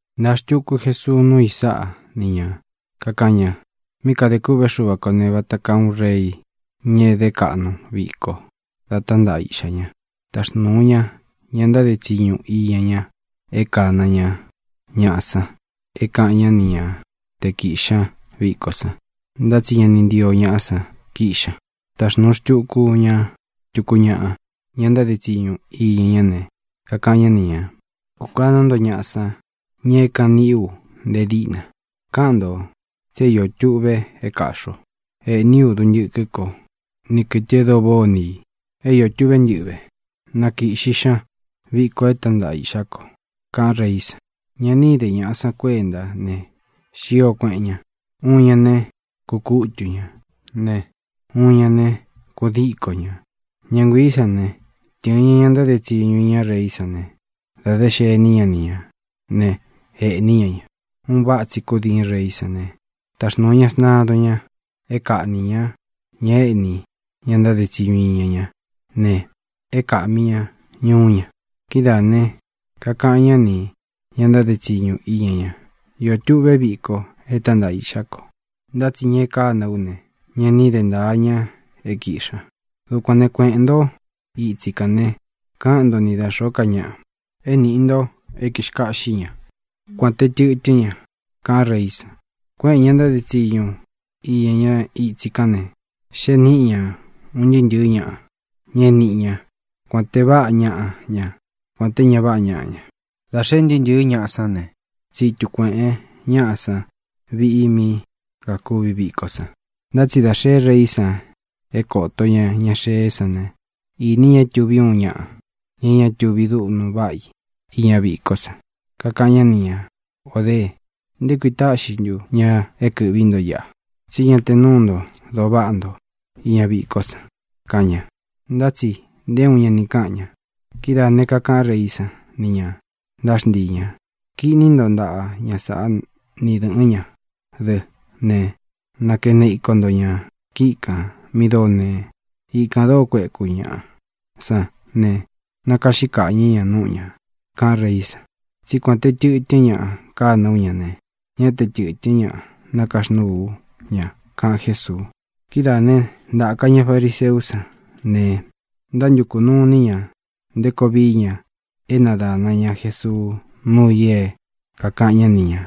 Ntāa xtuku Jesuu núu i sáꞌa ni ñā. Kakaꞌan ña: —Mí kadē kûꞌvé Xuva kō ne, vata kaa uun rei, ña é dé kaꞌnu viko dá tántaꞌa iꞌxá ña. Taxnūu ña ña ntáde tsiñu iña ña é kāna ña ñaꞌa san é kāꞌan ñá ni ña te kīꞌxi ña viko san. Ntá tsi ña ni ntío ñaꞌá san kiꞌxi ña. Taxnūu xtuku ña tuku ñaꞌa, ña ntáde tsiñu iña ñá ne, kakaꞌan ñá ni ñā: “Kūkaná nto ñaꞌa san, ña é kāꞌan niꞌí u nte díꞌna. Káꞌan ntō tsi é iō tuꞌve é kāꞌxi o. Ēꞌní u duntɨkɨ́ ko ni kɨ̄tɨ e dóo váꞌā ó ni ī. É iō tuꞌvé ntɨꞌɨ́ ve. Na kīꞌxi xña viko e tántaꞌa iꞌxá ko”, kaꞌán reí san. Ña ni íde ñāꞌa san kuéntá ne, xío kuēꞌen ña. Uun ña ne, kukútu ñā ne, uun ña ne, kudíko ñā. Ña nguiī sán ne, tɨ̄ɨn ña ña ntáde tsiñu iña reí san ne, dē xení ña ni ñā né, ēꞌní ña ña. Un váꞌa tsī kúdiin reí san ne, taxnūu ña sntadun ña é kaꞌnī ñá ña éꞌni ña ntáde tsiñu iña ñá ne, é na kāꞌmi ña ñuú ña. Kidáā ne, kakaꞌan ñá nī ña ntáde tsiñu iña ña: “Iō tuꞌvé viko e tántaꞌa iꞌxá ko, ntá tsi ña e kána ú ne, ñá ni de ntāa ña é kīꞌxi ña. Dukuān né, kueꞌēn ntó itsi kān ne, káꞌan nto ni da xōó ka ñaꞌa é nīꞌi nto é kīxkaꞌxí ña, kuān te tɨtɨ́n ña”, kaꞌán reí san. Kuéꞌēn ña ntáde tsiñu iña ñá itsi kān ne, xee níꞌi ña ūn ntɨɨ́ ntɨ̄ɨ́ ñaꞌa, ña é niꞌi ña, kuān te váꞌa ñaꞌa ña, kuān té ña váꞌa ñaꞌa ña. Dā xee un ntɨɨ́ ntɨ̄ɨ́ ñaꞌa sán ne, tsitu kuēꞌen ñáꞌa san viꞌi mí kākuvi viko san. ʼNtá tsi dā xee reí san é kōto ña ña xee sán ne, īni ña é tuví uun ñaꞌa, ña é ña tuvi dúꞌnu váꞌa i iña vikó san. Kakaꞌan ñá ni ñā: “O dee, ¿nté kui táꞌxi ntu ña é kɨ̄ꞌví nto iꞌa, tsí ña te núu nto doo váꞌa nto iña vikó san?”, kaꞌan ña. Ntá tsi nté uun ña ni káꞌan ña. Kidáā ne, kakaꞌan reí san nī ña ntáxntii ñā: “Kiꞌní nto ntaꞌa ña sāꞌá ni dɨ̄ꞌɨ́n ña dɨ́ ne, nakene iko nto ñā kíꞌi kān mi dóo nee. Ikān dóo kueku ñaꞌa san ne, nakaꞌxí kaꞌñɨ̄ ña núꞌu ñā”, kaꞌán reí san. Tsí kuān te tɨtɨ́n ñaꞌa kana ú ña ne, ñá te tɨtɨ̄n ñá nakaxnúū ú ña —kaꞌan Jésuu. Kidáā né, ntāka ña fariseú san ne, ntántukū nuu iní ña nté koo vií ña é nadāna ña Jesuu núu i é kākaꞌan ñá ni ñā.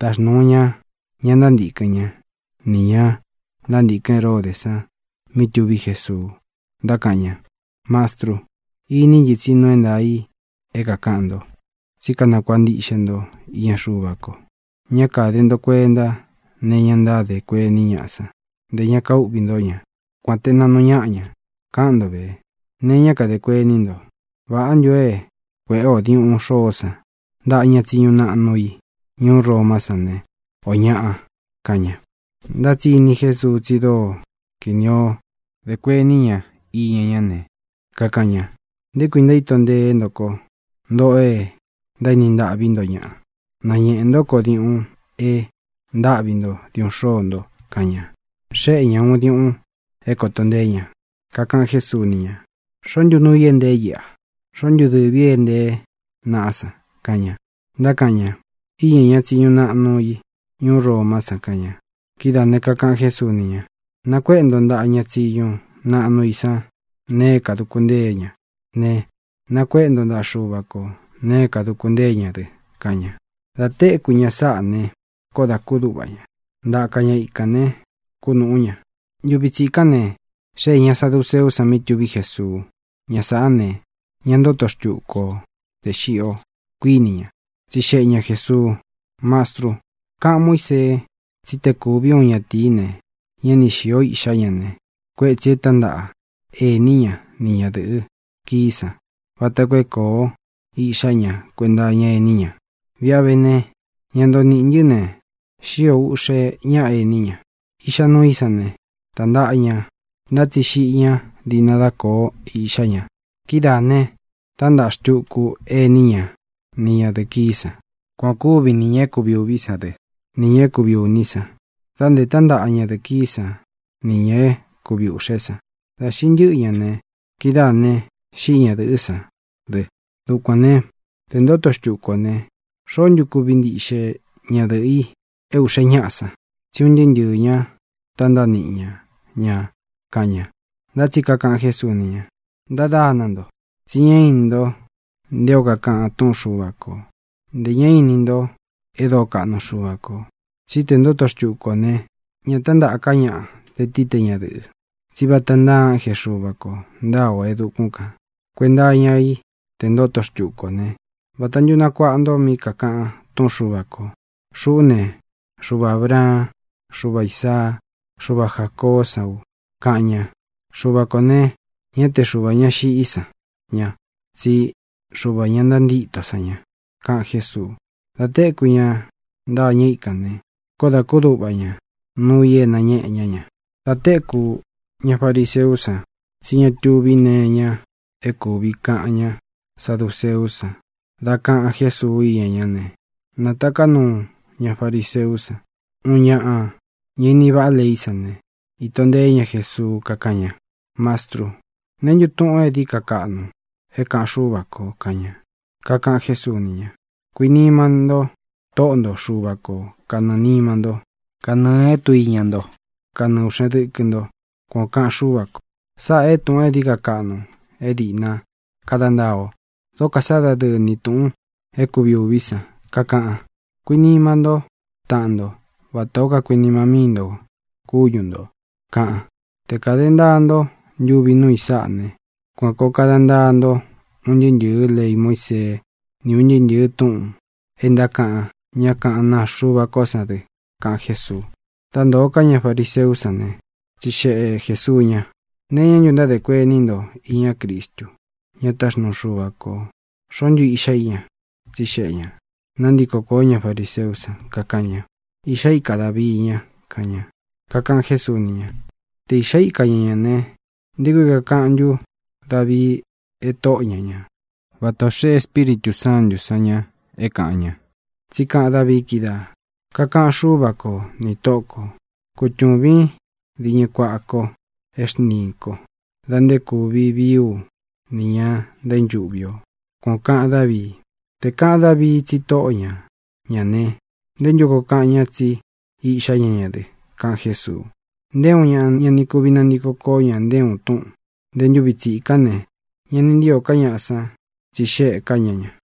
Taxnūu ña ña ntántīkɨn ñá nī ña ntántīkɨ́n Heródē san mí tuví Jesuu. Ntákaꞌan ña: —Mastrú, iní ntɨ tsi nuu é ntaā i é kākaꞌan nto, tsí kanakuāꞌa ntiꞌxe nto iña Xuva ko. Ñá kāde nto kuenta née iñá ntádē kuení ñaꞌa san. Ntē ña kaúꞌvī ntó ña, kuān te naꞌnu ñáꞌa ña. Káꞌan nto vē, nee iñá kadē kuení nto. ¿Vāꞌá ntu o é kuēꞌé ō diuꞌun xôó san ntaꞌa ña tsiñu naꞌnu i ñuú Romá san ne, ō ñaꞌa? —kaꞌan ña. Ntá tsi ini Jésuu tsi dóo kinī o dé kuení ña iña ñá ne, kakaꞌan ña: —¿Nté kui ntaíto nteé nto ko, ntōꞌo e ntaéni ntaꞌví nto ñaꞌa? Nañēꞌe ntó ko diuꞌun e ntáꞌvi nto diuꞌun xóō nto —kaꞌan ña. Xéꞌe ña ña ūun diuꞌun é kōto nteé ña. Kakaꞌan Jésuu ni ña: —¿Xoó ntu nuu i é ntee íꞌa? ¿Xoó ntu dɨvī í e ntée naꞌá san? —kaꞌan ña. Ntákaꞌan ña: —Íña ña tsiñu naꞌnu i ñuú Romá san —kaꞌan ña. Kidáā ne, kakaꞌan Jésuu ni ña: —Nakuéꞌe nto ntaꞌa ña tsiñu naꞌnu i san nee é kāduku ntée ña ne, nakuéꞌe nto ntaꞌa Xuva ko nēe é kāduku ntée ña dɨ —kaꞌan ña. Dā téku ña sáꞌā ne, koó dā kúduꞌva ña. Ntaka ña ikān ne, kúnūꞌú ña. Ntuvi tsikán ne, xéē ña saduceú san mí tuví Jesuu. Ña sāꞌá ne, ña ntóto xtuku o tē xiꞌi o, kuíni ña. Tsixeꞌe ña Jēsuu: —Mastrú, káꞌān Muísee tsí te kūví uun ñatīí ne, ñá ni xīó iꞌxá ña ne, kuétsī e tántaꞌa ení ña ni ñadɨ̄ꞌɨ kií san vata koo é kōo iꞌxá ña kuenta iña ení ña. Viꞌi a vé ne, ña ntoo niꞌī ntɨ́ ne, xío ūꞌxe ñáꞌa ení ña. Iꞌxa nuu í san ne, tántaꞌa ña, ntá tsi xiꞌi ñá diꞌna dá kōo iꞌxá ña. Kidáā ne, tántaꞌa xtuku ení ña ni ñadɨ̄ꞌɨ kií san. Kuan ō kúvi nī ña é kuvi ūví san dɨ, nī ña é kuvi ūní san, dā nte tántaꞌa ñadɨ̄ꞌɨ kií san nī ña é kuvi ūꞌxe san. Dā xiꞌi ntɨ́ꞌɨ ña ne, kidáā ne, xíꞌi ñadɨ̄ꞌɨ́ san dɨ. Dukuān né, te ntoto xtuku ō né, ¿Xoó ntu kuvi ntiꞌxe ñadɨ̄ꞌɨ i é ūꞌxe ñáꞌa san? Tsí un ntɨɨ́ ntɨɨ̄ ña tántaꞌa niꞌi ña ñā —kaꞌan ña. Ntá tsi kakaꞌan Jésuu ni ña: —Ntádana nto, tsi ñá ini nto nté o kakaꞌan túꞌun Xuva kō, ntē ñá ini nto e dóo kaꞌnu Xuva kō. Tsí te ntoto xtuku ō ne, ña tántaꞌa ká ñaꞌa, tē tií, te ñadɨ̄ꞌɨ. Tsí vata ntáa ánje Xuva kō ntáa ō e dukún kān. Kuenta iña í te ntoto xtuku ō né, vāta ntu nakuaꞌa nto mí kakaꞌan túꞌun Xuva kō: “Xuꞌú ne, Xuva Ābraan, Xúva Īsaa, Xúva Jācoó san u”, kaꞌan ña. Xuva kō ne, ñá te Xuvā ñá xiꞌí san ña, tsí Xuvā ña ntantíto san ña —kaꞌan Jésuu. Dā téku ña ntâñɨ íkān ne, koó dā kúduꞌva ñā nuu i é nañeꞌe ña ña. Dā téku ña fariseú san tsí ña tuví nee iña é kūvi kaꞌan ñá saduceú san dá kaꞌan Jésuu iña ñá ne, nátaká nuu ña fariseú san. Uun ñaꞌa, ñá ini váꞌa leí san ne, īto nteé ña Jesuu, kakáꞌan ña: —Mastrú, ¿neē ntú tuꞌun e dií ka kaꞌnu é kāꞌan Xúva kō? —kaꞌan ña. Kakaꞌan Jésuu ni ña: —“Kuinima nto Tóꞌo nto Xuva ko kanɨɨ̄ nima ntó, kanɨɨ̄ é tduiña nto, kanɨɨ ūꞌxen dɨkɨ nto.” Kuan ō kaꞌan Xúva kō. Sáꞌā e túꞌūn e dií ka kaꞌnu é dīꞌna kada ntaa o. Dókō sá dadɨɨ ni tūꞌun é kuvi ūví san. Kakaꞌan: “Kuinima ntó taꞌan nto vatā ó kakuinima míi nto kúñu ntō”, kaꞌan. Te kāda ntaa ntó ntuvi nuu i sáꞌa ne, kuan kōo kada ntaa nto un ntɨɨ́ ntɨ̄ɨ́ lei Muísee ni un ntɨɨ́ ntɨ̄ɨ́ túꞌūn e ntákaꞌan ñá kaꞌán naa Xuva kó san dɨ —kaꞌan Jésuu. Dá ntōo ká ña fariseú san ne, tsixeꞌe Jēsuu ña: —¿Nee iñá ntu ntádē kuení nto iña Cristu, ña táxnuu Xuva kō? ¿Xoó ntu iꞌxá i ña? —tsixeꞌe ñā. Nantíko kōó ña fariseú san, kakaꞌan ña: —Iꞌxá ika Dāvii ña —kaꞌan ña. Kakaꞌan Jésuu ni ña: —Te īꞌxá ikā ñá ña ne, ¿nté kui kakaꞌan ntú Davii é Tóꞌo ña ña, vata ō xeꞌe Espíritū Sántū san ña é kāꞌan ña? Tsí kaꞌan Dávii kídaā: Kakaꞌan Xúva ko nī Tóꞌō ko: “Kutūvín diñɨ kuaꞌa ko é xntiīn kó dā nté kūvi vii ú nī ña ntaínchuꞌvi o.” Kuan ō kaꞌan Dávii. Te kāꞌan Dávii tsi Tóꞌo ña ñā ne, ¿nté ntu koo kaꞌan ña tsí iꞌxá ña ña dɨ? —kaꞌan Jésuu. Nté uun ña ña ni kuvi nantiko koó ña nté uun túꞌūn. Nté ntūvi tsikán ne, ña ni ntío ká ñaꞌa san tsixéꞌē ká ña ña.